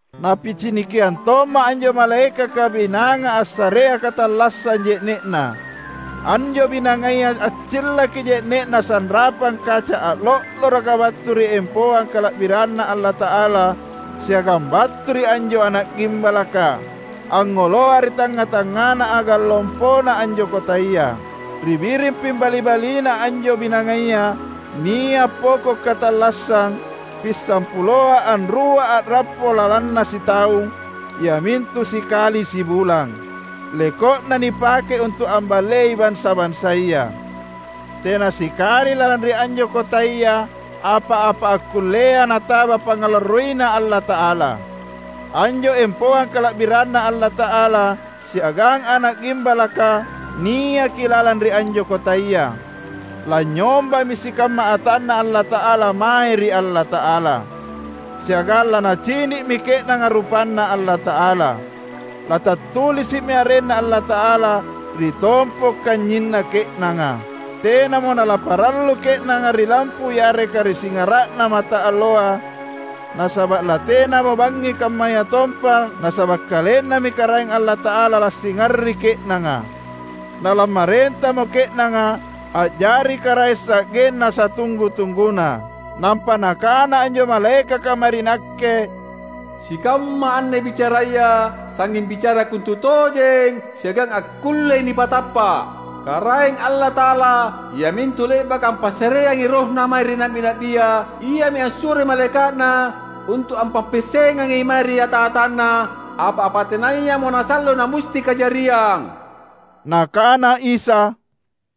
Napicinikiang tomma’ anjo malaekaka binanga assarea katallassang je’ne’na. Anjo binangaya accillaki je’ne’na sanrapang kaca a’lo’loroka battu ri empoang kala’biranNa Allata’ala siagang battu ri anjo Ana’ Gimbalaka, angngoloa ri tangnga-tangngana agang lompona anjo kotaya. Ri biring pimbali-baliNa anjo binangaya, nia’ poko’ katallassang, pissampuloa anrua a’rappo lalanna sitaung, iamintu sikali sibulang. Leko’na nipakei untu’ amballei bansa-bansaya. Tena sikali lalang ri anjo kotaya apa-apa akkullea nataba pangngalarroiNa Allata’ala. Anjo empoang kala’biranNa Allata’ala siagang Ana’ Gimbalaka niaki lalang ri anjo kotaya. Lanynyombami sikamma atanNa Allata’ala mae ri Allata’ala; siagang lanacini’mi ke’nanga rupanNa Allata’ala. Latattulisi’mi arenNa Allata’ala ri tompo’ kanynyinna ke’nanga. Tenamo nalaparallu ke’nanga ri lampu yareka ri singara’na mataalloa, nasaba’ latenamo bangngi kammayatompa nasaba’ KalenNami Karaeng Allata’ala lansingari ke’nanga. Nalammarentamo ke’nanga, a’jari karaeng sa’genna satunggu-tungguna. Nampa nakana anjo malaekaka mae ri nakke, "Sikamma anne bicaraya sangnging bicara kontutojeng siagang akkullei nipatappa’. Karaeng Allata’ala iamintu le’baka ampassareangi RohNa mae ri na’bi-na’bia, iami assuroi malaeka’Na untu’ ampappiassengangi mae ri ata-atanNa apa-apa tenayamo nasallo namusti kajariang." Nakana Isa,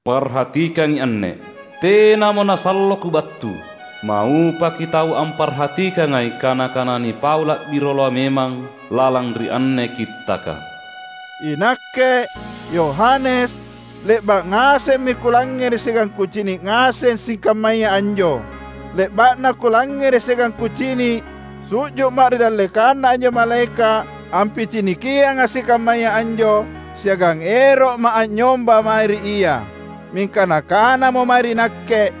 "Parhatikangi anne! Tenamo nasallo Kubattu. Maupaki tau amparhatikangai kana-kana nipau la’bi rioloa memang lalang ri anne kittaka!" Inakke, Yohanes, le’ba’ ngasemmi kulangngere’ siagang kucini’ ngaseng sikammaya anjo. Le’ba’na kulangngere’ siagang kucini’, su’ju’ma’ ri dallekanna anjo malaeka’ ampicinikianga’ sikammaya anjo, siagang ero’ma’ anynyomba mae ri ia; mingka nakanamo mae ri nakke,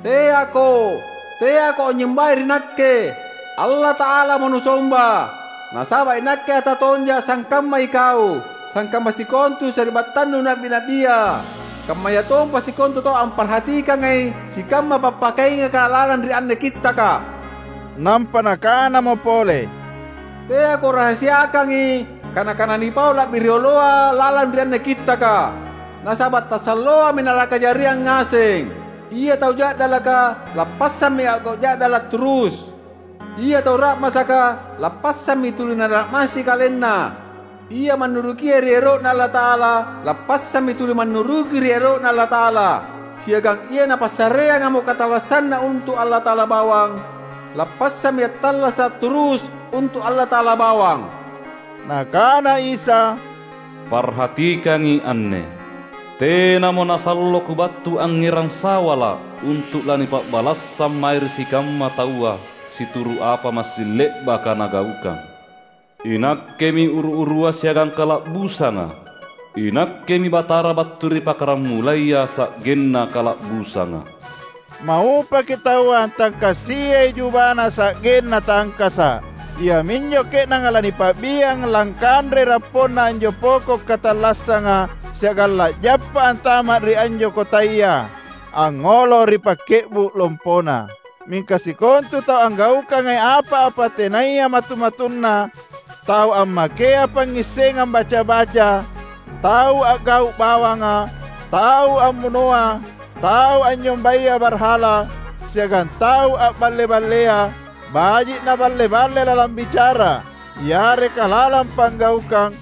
"Teako! Teako anynyombai ri nakke! Allata’alamo nusomba! Nasaba’ inakke ata tonja’ sangkamma ikau, sangkamma sikontu sari’battannu na’bi-na’bia, kammayatompa sikontu tau amparhatikangai sikamma pappakaingaka lalang ri anne kittaka!" Nampa nakanamo pole, "Teako rahasiakangi kana-kana nipau la’bi rioloa lalang ri anne kittaka, nasaba’ tasalloami nalakajariang ngaseng. Ia tau ja’dalaka, lappassammi a’gau’ ja’dala’ turus; ia tau ra’masaka lappassammi tuli nara’massi kalenna; ia mannurukia ri ero’Na Allata’ala lappassammi tuli mannuruki ri ero’Na Allata’ala, siagang ia napassareangamo katallassanna untu’ Allata’ala bawang, lappassammi attallasa’ turus untu’ Allata’ala bawang." Nakana Isa, "Parhatikangi anne! Tenamo nasallo Kubattu angngerang sawala’ untu’ lanipa’balassang mae ri sikamma taua situru’ apa massing le’baka nagaukang. INakkemi uru-urua siagang kala’busanga; iNakkemi Batara battu ri Pakaramulaya sa’genna Kala’busanga." Maupaki tau antangkasiai jubana sa’genna tangkasa’. Iaminjo ke’nanga lanipa’biang langkanrei rapponna anjo poko’ katallassanga, siagang la’jappa antama’ ri anjo kotaya, angngolo ri pakke’bu’ lompona. Mingka sikontu tau anggaukangai apa-apa tenaya matu-matunna, tau ammakea pangngissengang baca-baca, tau a’gau’ bawanga, tau ammunoa, tau anynyombaya barhala, siagang tau a’balle-ballea, baji’ na’balle-balle lalang bicara yareka lalang panggaukang,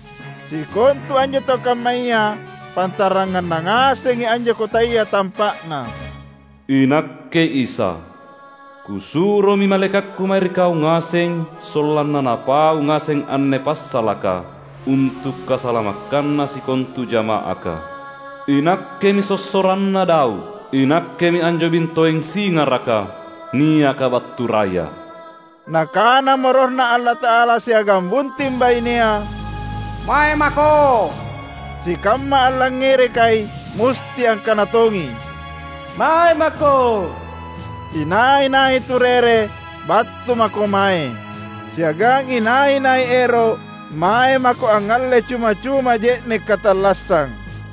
sikontu anjo tau kammaya pantaranganna ngasengi anjo kotaya tampa’na. "INakke Isa, Kusuromi malaekakKu mae ri kau ngaseng sollanna napau ngaseng anne passalaka untu’ kasalamakkanna sikontu jama’aka. INakkemi sossoranna Daud; iNakkemi anjo bintoeng singaraka, niaka battu raya." Nakanamo RohNa Allata’ala siagang Bunting Bainea, "Mae mako!" Sikamma allangngerekai musti angkana tongi, "Mae mako!" Inai-nai turere, battu mako mae! Siagang inai-nai ero’ mae mako angngalle cuma-cuma je’ne’ katallassang!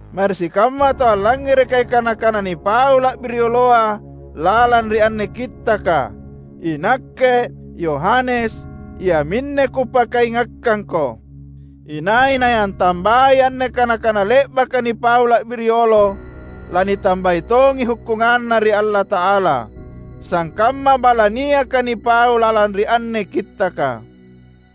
Mae ri sikamma tau allangngerekai kana-kana nipau la’bi rioloa lalang ri anne Kittaka, inakke, Yohanes, iaminne kupakaingakkangko: Inai-nai antambai anne kana-kana le’baka nipau la’bi riolo, lanitambai tongi hukkunganNa ri Allata’ala, sangkamma bala niaka nipau lalang ri anne kittaka.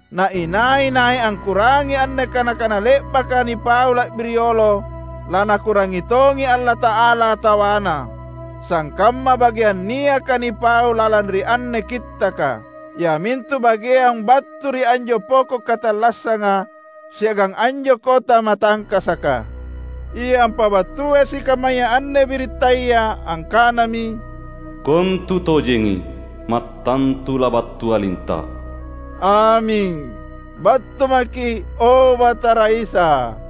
Na inai-nai angkurangngi anne kana-kana le’baka nipau la’bi riolo, laNakurangngi tongi Allata’ala tawana, sangkamma bageang niaka nipau lalang ri anne kittaka; iamintu bageang battu ri anjo poko’ katallassanga siagang anjo kota matangkasaka. Ia ampabattuai sikammaya anne birittaya angkanami, "Kontutojengi, mattantu labattuA’ linta’!" Aming! Battu maKi’, o Batara Isa!